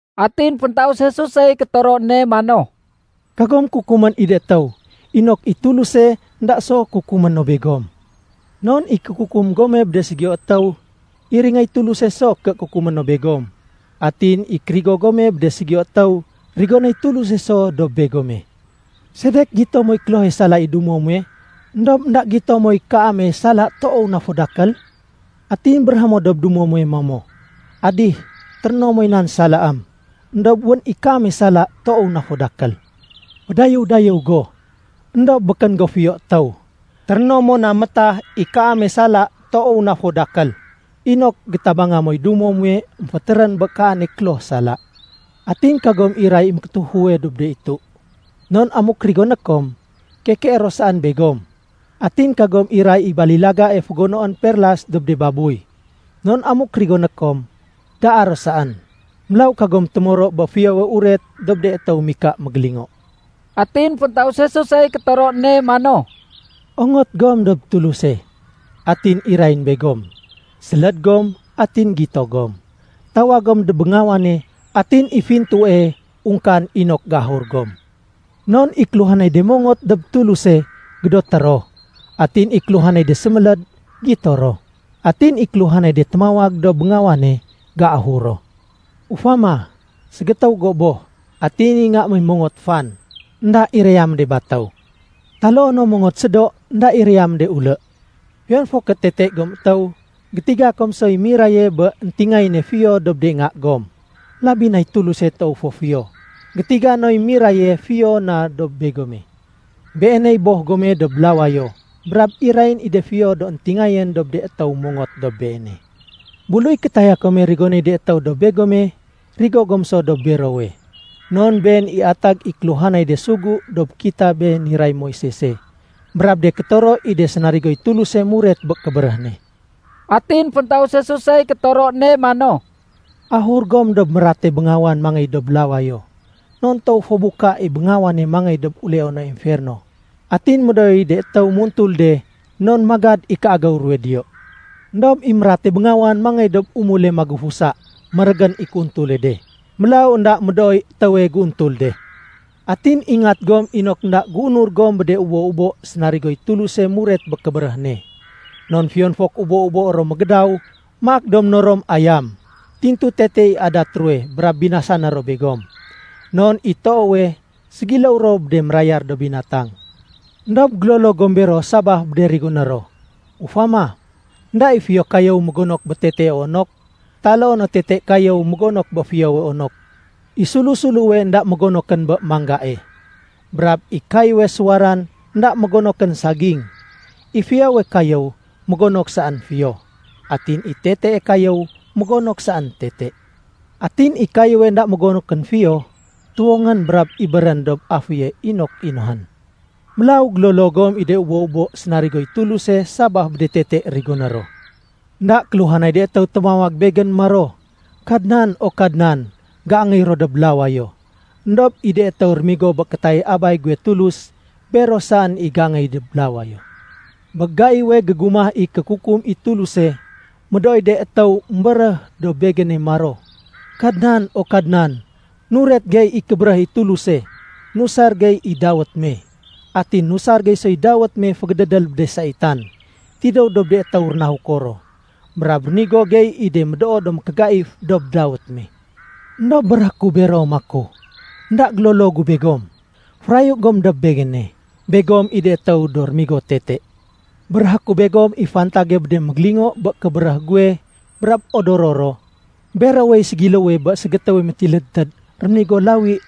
Atin féntaus Jesusey kétoro ne mano, “Kagom kukumén i de étéw, inok i Tuluse énda so kukumé no begom. Non i kékukum gome bé de ségiyo étéw, iringéy Tuluse so ké kukumé no begom. Atin i kérigo gome bé de ségiyo étéw, rigonéy Tuluse so dob begome. Sedek gito moy klohe sala i dumo muwe, éndob énda gito moy kaame sala toow na fo dakél? Atin béréhé mo dob dumo muwe mamo, ‘Adih, téréno moy nan salaém.’ Endob wén i kaame sala toow na fo dakél. Fédayéw-dayéw go, éndob békén go fiyo étéw. Téréno mo na métah i kaame sala toow na fo dakél, inok gétabanga moy dumo muwe émfétérén bé kaane kloh sala. “Atin kagom iray i mékétéfuwe dob de itu. Non amuk rigoné kom, kekeé ro saén begom. Atin kagom iray i balilagae fégonoén perlas dob de babuy. Non amuk rigoné kom, daa ro saén. Mélaw kagom témoro bé Fiyowe Uret dob de étéw mika mégélingo.” Atin féntaus Jesusey kétoro ne mano, “Ongot gom dob Tuluse atin irayén begom. Séléd gom, atin gito gom. Tawag gom dob béngawane, atin i fintue ungkaén inok géahur gom. Non i kéluhanay de mongot dob Tuluse, gédoté ro. Atin i kéluhanay de séméléd, gito ro. Atin i kéluhanay de témawag dob béngawane, géahur ro. Ufama, ségétéw go boh, atin i nga me mongot fan, énda iraya mo de batéw. Taloo no mongot sédo, énda iraya mo de ulé. Fiyon fo ké tete gom étéw, gétiga kom soy miraye bé éntingayéne fiyo dob de nga gom. Labi nay Tuluse toow fo fiyo, gétiga noy miraye fiyo na dob begome. Beeney Boh gome dob lawayo, brab irayén i de fiyo do éntingayén dob de étéw mongot dob Beene. “Buluy kétaya kome rigonéy de étéw dob begome, rigo gom so dob berowe. Non been i atag i kéluhanay de sugu dob kitabé niray Moisese brab de kétoro i de sénarigoy Tuluse muret bé kébéréh ne.” Atin féntaus Jesusey kétoro ne mano, “Ahur gom dob mérate béngawan mangey dob lawayo. Non toow fo buka i béngawane mangéy dob uleone emferno atin médooy de étéw muntul de non magad i kéagéw ruwe diyo. Endob i mérate béngawan mangéy dob umule magufusa, mérégén i kéuntule de. Mélaw énda médooy étéwe géuntul de. “Atin ingat gom inok énda géunur gom bé de ubo-ubo sénarigoy Tuluse muret bé kébéréh ne. Non fiyon fo ké ubo-ubo ro mégédaw maak do ménorom ayam, tintu tete i adat ruwe brab binasané ro begom. Non i toowe, ségiléw ro bé de mérayar do binatang. Endob gélolo gom bero sabaf bé de rigoné ro. Ufama, énda i fiyo kayéw mégonok bé tetee onok, taloo no tete kayéw mégonok bé fiyowe onok. I sulu-suluwe énda mégonokén bé manggae. Brab i kayéwe suwaran énda mégonokén saging. I fiyowe kayéw mégonok saén fiyo, atin i tetee kayéw mégonok saén tete. Atin i kayéwe énda mégonokén fiyo, tuwongén brab ibérén dob aféye inok inohén. Mélaw gélolo gom i de ubo-ubo sénarigoy Tuluse sabaf bé de tete rigoné ro. “Enda kéluhanay de étéw témawag Begén maro, ‘Kadnan, o Kadnan,’ géangéy ro dob lawayo. Endob i de étéw rémigo bé kétayay Abay guwe Tulus, bero saén i géangéy dob lawayo. Bé gaiwe gégumah i kékukum i Tuluse, médooy de étéw émbéréh dob Begéne maro, ‘Kadnan, o Kadnan, nuret gey i kébéréh i Tuluse nusar gey i dawét me. Atin nusar gey soy dawét me fégédédél bé de saitan tidéw dob de étéw rénahuko ro, brab rénigo gey i de médoo do mékégaif dob dawét me.’ Endob béréhé ku bero maku, ‘Enda gélolo gu begom. Férayu gom dob Begéne. Begom i de étéw do rémigo tete.’ “Béréhé ku begom i fantage bé de mégélingo bé kébéréh guwe brab odoro ro. Berowey ségiléwe bé ségétéwe métilédtéd réménigo lawi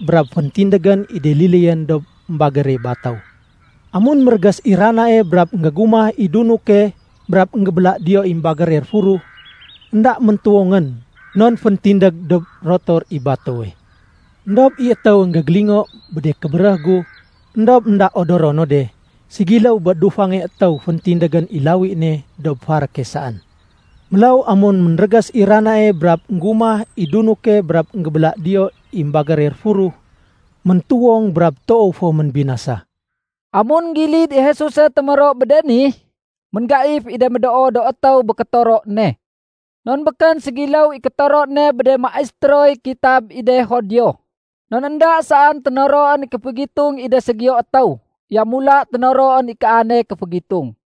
brab féntindégén i de liléyén dob émbagére batéw. Amun mérégés i ranae brab énggégumah i dunuke brab énggébéla diyo i émbagére réfuruh, énda méntuwongén non féntindég dob rotor i batéwe. “Endob i étéwe énggélingo bé de kébéréh gu éndob énda odoro no de, ségiléw bé dufange étéw féntindégén i lawi ne dob faréke saén. Mélaw amun ménrégés i ranae brab énggumah i dunuke brab énggébéla diyo i émbagére réfuruh, méntuwong brab toow fo ménbinasa.” Amun énggilid i Jesuse témoro bé de ni, ménggaif i de médoo do étéw bé kétoro ne. Non békén ségiléw i kétoro ne bé de maistéroy kitab i de Judio. Non énda saén ténoroén i kéfégitung i de ségiyo étéw. Yamula ténoroén i kaane kéfégitung.